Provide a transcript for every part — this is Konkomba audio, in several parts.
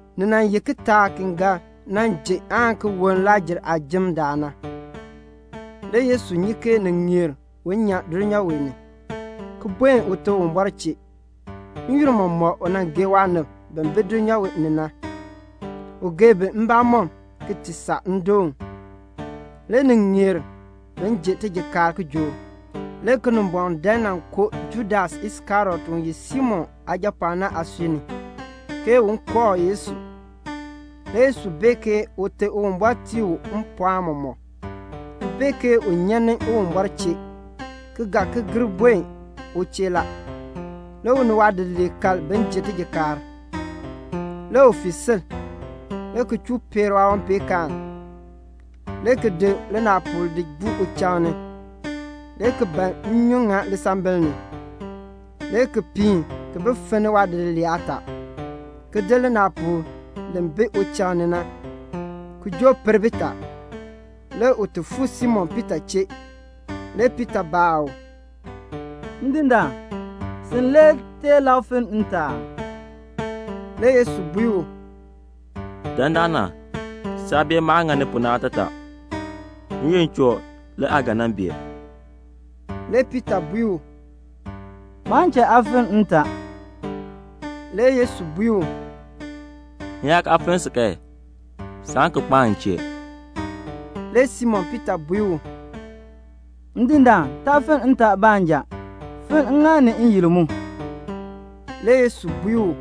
Ni nan ye kitaak ki ga nan ji aan ki woln Lakr-jer aajim daal na. Le Yesu nyi ke ni ŋeer un nyan dulnyaa wee ni, ki buen Ute Uwumbɔr chee. N-yoonn mɔmɔk u nan gee waanib bi bi dulnyaa ni na. U gee bi mbamɔm ki ti saa ndoon. Le ni ŋeer bin ji tijikaar kijook. Le Kinimbɔŋ dan nan koo Judas Iskariot u ye Simon aajapɔɔn na aasui ni, ke un kooh Yesu. Le Yesu bee ke Ute Uwumbɔr tii u mpɔɔn mɔmɔk, ki bee ke u nyan ni Uwumbɔr chee, ki ga ki gir buen u chee la. Le u ni waadidiliib kal bin ji tijikaar. Le u fii sil, le ki chuu peer waawanpeenkaan, le ki di linaapuul ki di buu uchaŋ ni, le ki ban nnyun ŋa lisambil ni, le ki piin ki bi finni waadidiliib aataa, ki di linaapuul li bi uchaŋ ni na, ki joo per bitaa. Le u ti fuu Simon Piita chee. Le Piita baa u, "Ndindaan, sin le tee lab finn ntaa aa?" Le Yesu bui u, "Dandana, saa bee maah ŋani pu na aatataa. N-yoonn choo le aa ga nan bee." Le Piita bui u, "Maan cha aa finn ntaa." Le Yesu bui u, "M yaa kaa finn si kan, saan ki kpaan m chee." Le Simon Piita bui u, "Ndindaan, taa finn ntaa baanja. Finn ŋŋaal ni n-yil mu." Le Yesu bui u,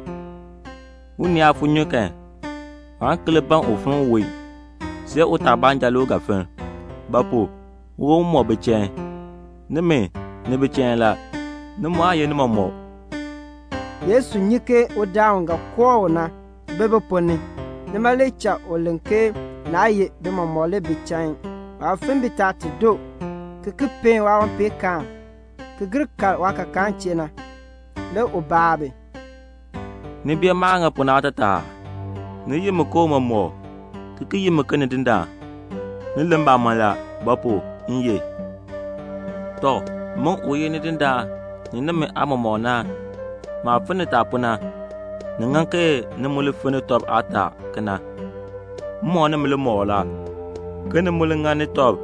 "Unii yaa fu nnyun kan, waan ki li ban un finn uwon, see utaa baanja le u ga finn; ba pu? uwon mɔmɔk bi chain. Nimi, ni bi chain la; ni mu aa ye ni mɔmɔk." Yesu nyi ke udaan u ga kooh u na bi bi ponn ni, nima le cha u len ke naa ye bi mɔmɔk le bi chain. Waah finn bitaa ti doo, ki ki peen waawanpeenkaan, ki gir kal waakakaa chee na, le u baa bi, "Ni bee maah ŋa pu na aatataa aa? Ni yi mi ke Tiicha, ki ki yi mi ke Nidindaan. Ni len mbamɔn la; ba pu? m ye. Tɔ, min u ye Nidindaan ni nimi Aatiicha na, maah finn nitaa pu na, ni ŋan ke ni mu li finni tɔb aataa kena. M mɔk nimi limɔkl la, ke ni mu li ŋani tɔb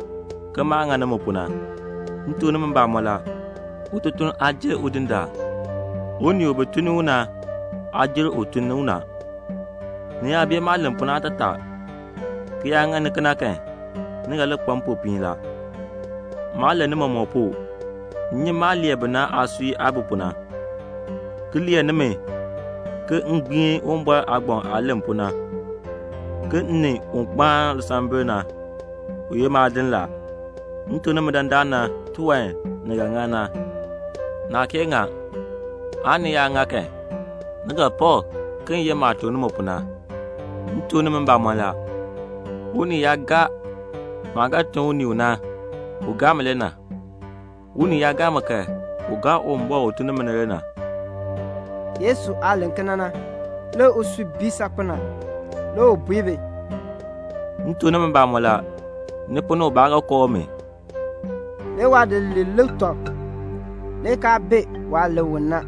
ke maah ŋa nimi pu na. M tuk nimi mbamɔn la, ututuln aa jer udindaan. Unii u bi tun ni u na, aa jer un tun u na. Ni yaa bee maah len pu na aatataa, ki yaa ŋani kena kan, ni ga li kpa mpopiin la. "Maa len ni mɔmɔk pu. M nyi maah lee bi na aasui ni aah bi pu na, ki lee nimi ke m gbiin Uwumbɔr aagbaŋ aah len pu na, ke 'M ni un kpaan lisambil na, u ye maadin la.' M tuk nimi dandana tiwan ni ga ŋa na, naa kee ŋa, aan ni yaa ŋa kan, ni ga pak ke m ye maah tuk nimi pu na. M tuk nimi mbamɔn la, unii yaa gaa maah ga tun unii u na, u gaa mi le na. Unii yaa gaa mi kan, u gaa Uwumbɔr u tun ni mi na le na." Yesu aah len kena na, le usui bii saakpen a. Le u bui bi, "M tuk nimi mbamɔn la, ni ponn ni ubaa ga kooh mi." Le waadidiliib lik tɔb, le kaa bee waah len u na.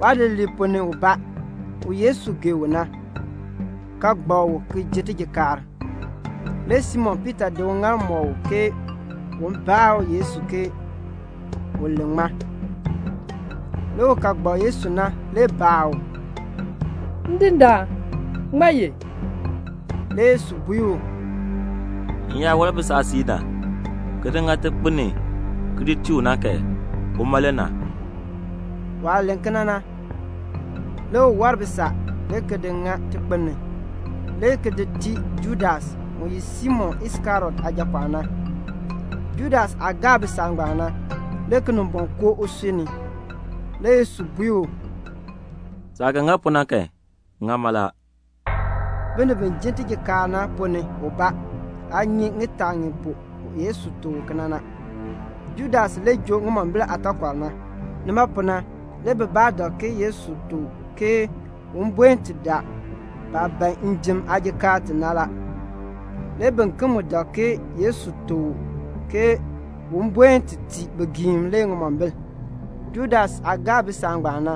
Waadidiliib ponn ni ubaa, u Yesu gee u na, ka gbak u ki ji tijikaar. Le Simon Piita di uŋaal mɔk u ke un baa Yesu ke u len ŋmaa. Le un ka gbak Yesu na le baa u, "Ndindaan, ŋmaa ye?" Le Yesu bui u, "M yaa war bisaa siib na, ki di ŋa tikpin ni ki di tii u na kan, uma le na." Waah len kena na, le u war bisaa le ki di ŋa tikpin ni, le ki di tii Judas, u ye Simon Iskariot aajapɔɔn na. Judas aah gaa bisaa ngbaan na, le Kinimbɔŋ koo usui ni. Le Yesu bui u, "Saah ga ŋa pu na kan, ŋa mala." Binib bi ji tijikaar na ponn ni ubaa aa nyi ŋitaa ŋi pu Yesu tuk u kena na. Judas le joo ŋimombil aataakɔr na. Nima pu na le bibaa dak ke Yesu tuk u ke un buen ti daa baah ban njim aajikaar ti na la. Le biken mu dak ke Yesu tuk u ke un buen ti tii bigiim le ŋimombil. Judas aah gaa bisaa ngbaan na,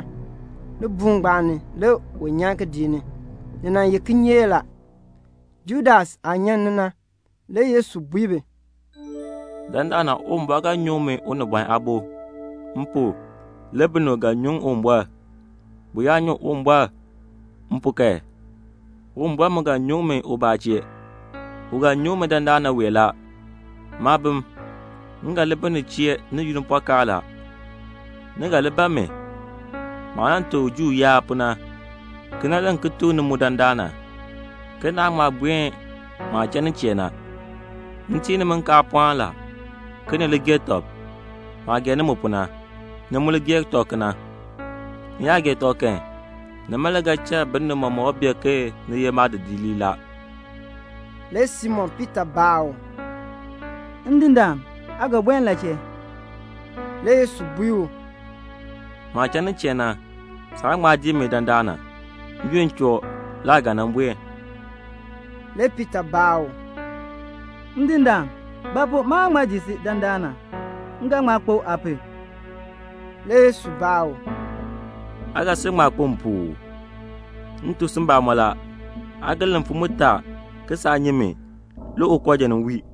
libuul ngbaan ni le u nyan kidiik ni. Ni nan ye kinyeek la. Judas aah nyan ni na, le Yesu bui bi, "Dandana Uwumbɔr ga nyuŋ min Unibɔn Aabo. M pu, le binib ga nyuŋ Uwumbɔr. Bi yaa nyuŋ Uwumbɔr m pu kan, Uwumbɔr mu ga nyuŋ mi ubaa chee. U ga nyuŋ mi dandana wee la. Maabim, m ga li bi ni chee ni yunn pɔkaa la. Ni ga li ban mi. Maah nan tuk Juu yaab pu na, kena le m ki tuk ni mu dandana, ke naan ŋma buen maah cha nin chee na. M tii nimi nkaalpɔɔn la, ke ni li gee tɔb. Maah gee nimi pu na, ni mu li gee tɔb kena. Ni yaa gee tɔb kan, nima le ga cha binib mɔmɔk bee ke ni ye maadidiliib la." Le Simon Piita baa u, "Ndindaan, aa ga buen la chee?" Le Yesu bui u, "Maah cha nin chee na, saan ŋma dii mi dandana. N-yoonn choo le aa ga buen." Le Piita baa u, "Ndindaan, ba pu maan ŋma dii si dandana? M ga ŋma kpo aa pu." Le Yesu baa u, "Aa ga sil ŋma kpo m pu uu? M tuk si mbamɔn la, aa ga len mfim mutaa ke saa nyi mi, le ukooja nin wii."